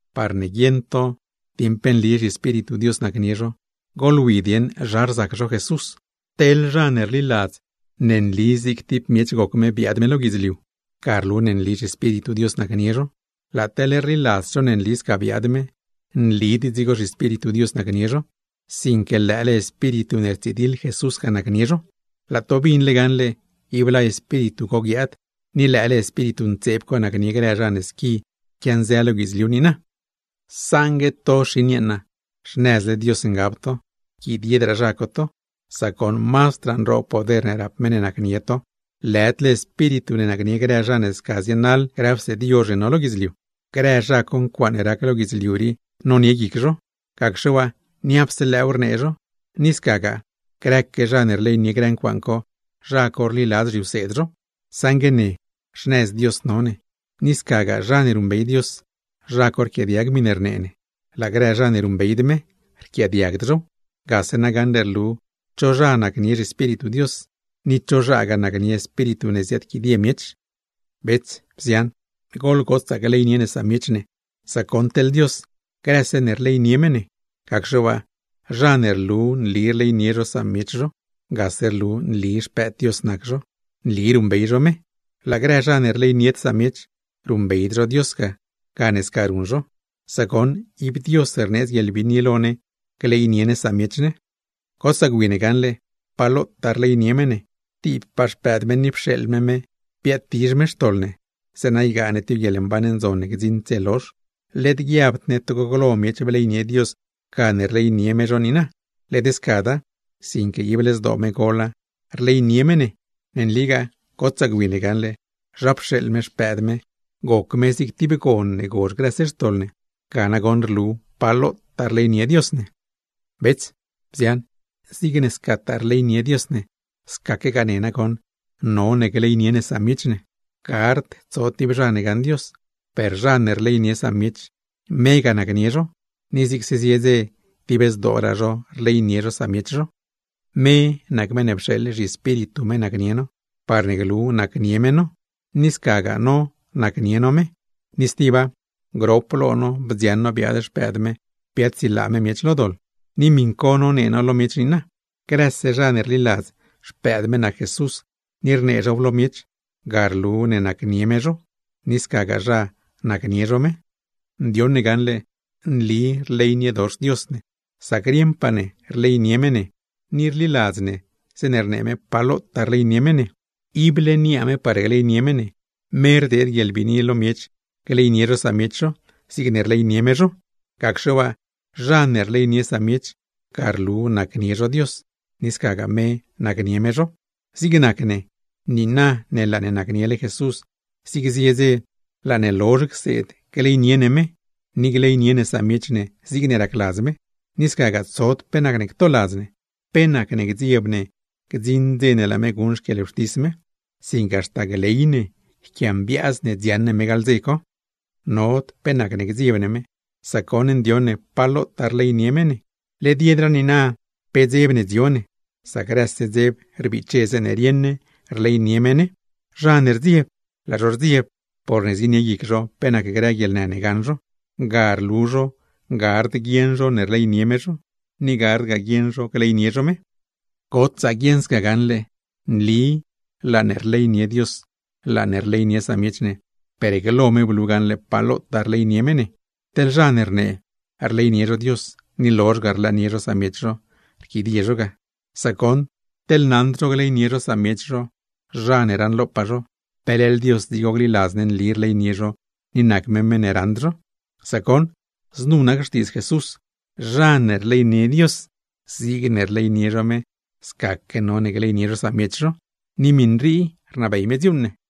Parne guieṉ to dieṉ pe nli zhiEspíritu Dios nacnie zho, goḻwi dieṉ zha rzac zho Jesús: Teḻ zha ne rliladz ne nli zig tib miech goc me biaad me lo guidzliu, ga rlu ne nli zhiEspíritu Dios nacnie zho. Laa teḻ rliladzd zho ne nli sca biaad me, nlid dzigo zhiEspíritu Dios nacnie zho; sinque lëële espíritu ne rtsidiḻ Jesús ga nacnie zho. Laa to binle gaṉle ib laa espíritu co guiaad; ni lëële espíritu ntseeb co nacnie grë zha ne squi quianzë lo guidzliu niina. Xin yeeṉa, saṉgue to xnëzle Dios ngab to, yquidiedraa zha co to, sac goṉ mazdraa nroob poder rap meṉ ne nacnie to, lëdle espíritu ne nacnie grë zha ne sca zienaḻ grë wseed yozh ne no lo guidzliu. Grë zha co, ncuaaṉe rac lo guidzliu rii nonie guic zho; gacxe waa, niapse lëëw rnee zho, ni gagaa grëque zha ne rleynie grë ncuaaṉ co, zha co rliladz zhiwseed zho. Saṉgue ne xnëz Dios no ne. Ni scagaa zha ne ruṉbey Dios, zha co rquiaadiag miṉe rnee ne; laa grë zha ne ruṉbeyd me, rquiaadiagd zhow. Gase na gaṉle rlu cho zha nacnie zhiEspíritu Dios, ni cho zhagaa nacnie espíritu ne ziaadquidie miech. Bets, bzian, goḻgotsaa gleynie ne samiech ne, sac goṉ, teḻ Dios grëse ne rleynie me ne. Gacxe waa, zha ne rlu nli rleynie zho samiech zho, gase rlu ne nli xpëëd Dios nac zho, nli ruṉbey zho me. Laa grë zha ne rleynied samiech, ruṉbeyd zho Dios ga gane sca ruṉ zho; sac goṉ ib Dios rneedz guieḻbiini lo ne gleynie ne samiech ne. Gotsaa gwi ne gaṉle, pa lotaa rleynie me ne: Tibpaa Xpëëd me, ni pxeeḻ me me biaadtizh me xtoḻ ne, zeeṉa ygaa ne tib guieḻmban ndzon ne gdziṉd dze lozh. Led guiabd ne togo glo miech bleynie Dios gane rleynie me zho niina; led scada, sinque ible zdoo me gola rleynie me ne. Ne nligaa gotsaa gwi ne gaṉle zha pxeeḻ me Xpëëd me, goc me zig tib gon ne gozh grëse xtoḻ ne. Ga nagoṉ rlu pa lotaa rleynie Dios ne. Bets, bzian, zigne scataa rleynie Dios ne, scaquegaa ne nagoṉ none gleynie ne samiech ne. Gard tso tib zha ne gaṉ Dios, per zha ne rleynie samiech, me ga nacnie zho; ni zigse zie dze dib zdooraa zho rleynie zho samiech zho. Me nac meṉ ne pxeeḻ zhiEspíritu me nacnie no, parne glu nacnie me no, ni scagaa no nacnie no me. Ni stiba, grop lo no bdzioṉ no biaad Xpëëd me biaadsilaa me miech lo doḻ; ni miṉ co nonee no lo miech niina. Grëse zha ne rliladz Xpëëd Dios nac Jesús, ni rnee zhow lo miech, ga rlu ne nacnie Dios zho, ni scagaa zha nacnie zho me. Ndioṉ ne gaṉle nli rleyniedox Dios ne, sac rieṉpaa ne rleynie me ne, ni rliladz ne zeeṉe rnee me pa lotaa rleynie me ne. Ible niaa me par gleynie me, me rdeed guieḻbiini lo miech gleynie zho samiech zho, zigne rleynie me zho; gacxe waa, zha ne rleynie samiech, ga rlu nacnie zho Dios, ni scagaa me nacnie me zho. Zig nac ne, niina ne laa ne nacniele Jesús, zig zie dze laa ne lozh cseed gleynie ne me, ni gleynie ne samiech ne zigne racladz me; ni scagaa tsod pe nacne ctoladz ne, pe nacne gdzieb ne gdziṉ dze ne laa me guṉ xquieḻwxtis me; sinque haxta gley ne dziaṉ ne me gaḻ dze co. Nod pe nacne gdzieb ne me, sac goṉ ndioṉ ne pa lotaa rleynie me ne. Led yedraa niina pe dzeb ne dzio ne, sac grëse dzeb rbiche zeeṉe rieṉ ne rleynie me ne. Zha ne rdzieb, zienie guic zho pe nac grë guieḻnë ne gaṉ zho, ga rlu zho gard guieṉ zho ne rleynie me zho, ni gardgaa guieṉ zho gleynie zho me. Gotsaa guieṉ sca gaṉle, nli laa ne rleynie Dios, laa ne rleynie samiech ne, per glo me blu gaṉle pa lotaa rleynie me ne. Teḻ zha ne rnee, rleynie zho Dios, ni rlozh ga rlëënie zho samiech zho, rquidie zho ga. Sac goṉ, teḻ naṉd zho gleynie zho samiech zho, zha ne raṉlopaa zho, ¿pe leḻ Dios dzigo gliladz ne nli rleynie zho, ni nac me meṉ ne raṉd zho? Sac goṉ, znu nac xtiidz Jesús: Zha ne rleynie Dios, zigne rleynie zho me, scaque none gleynie zho samiech zho. Ni miṉ rii rnabey me dziuuṉ ne.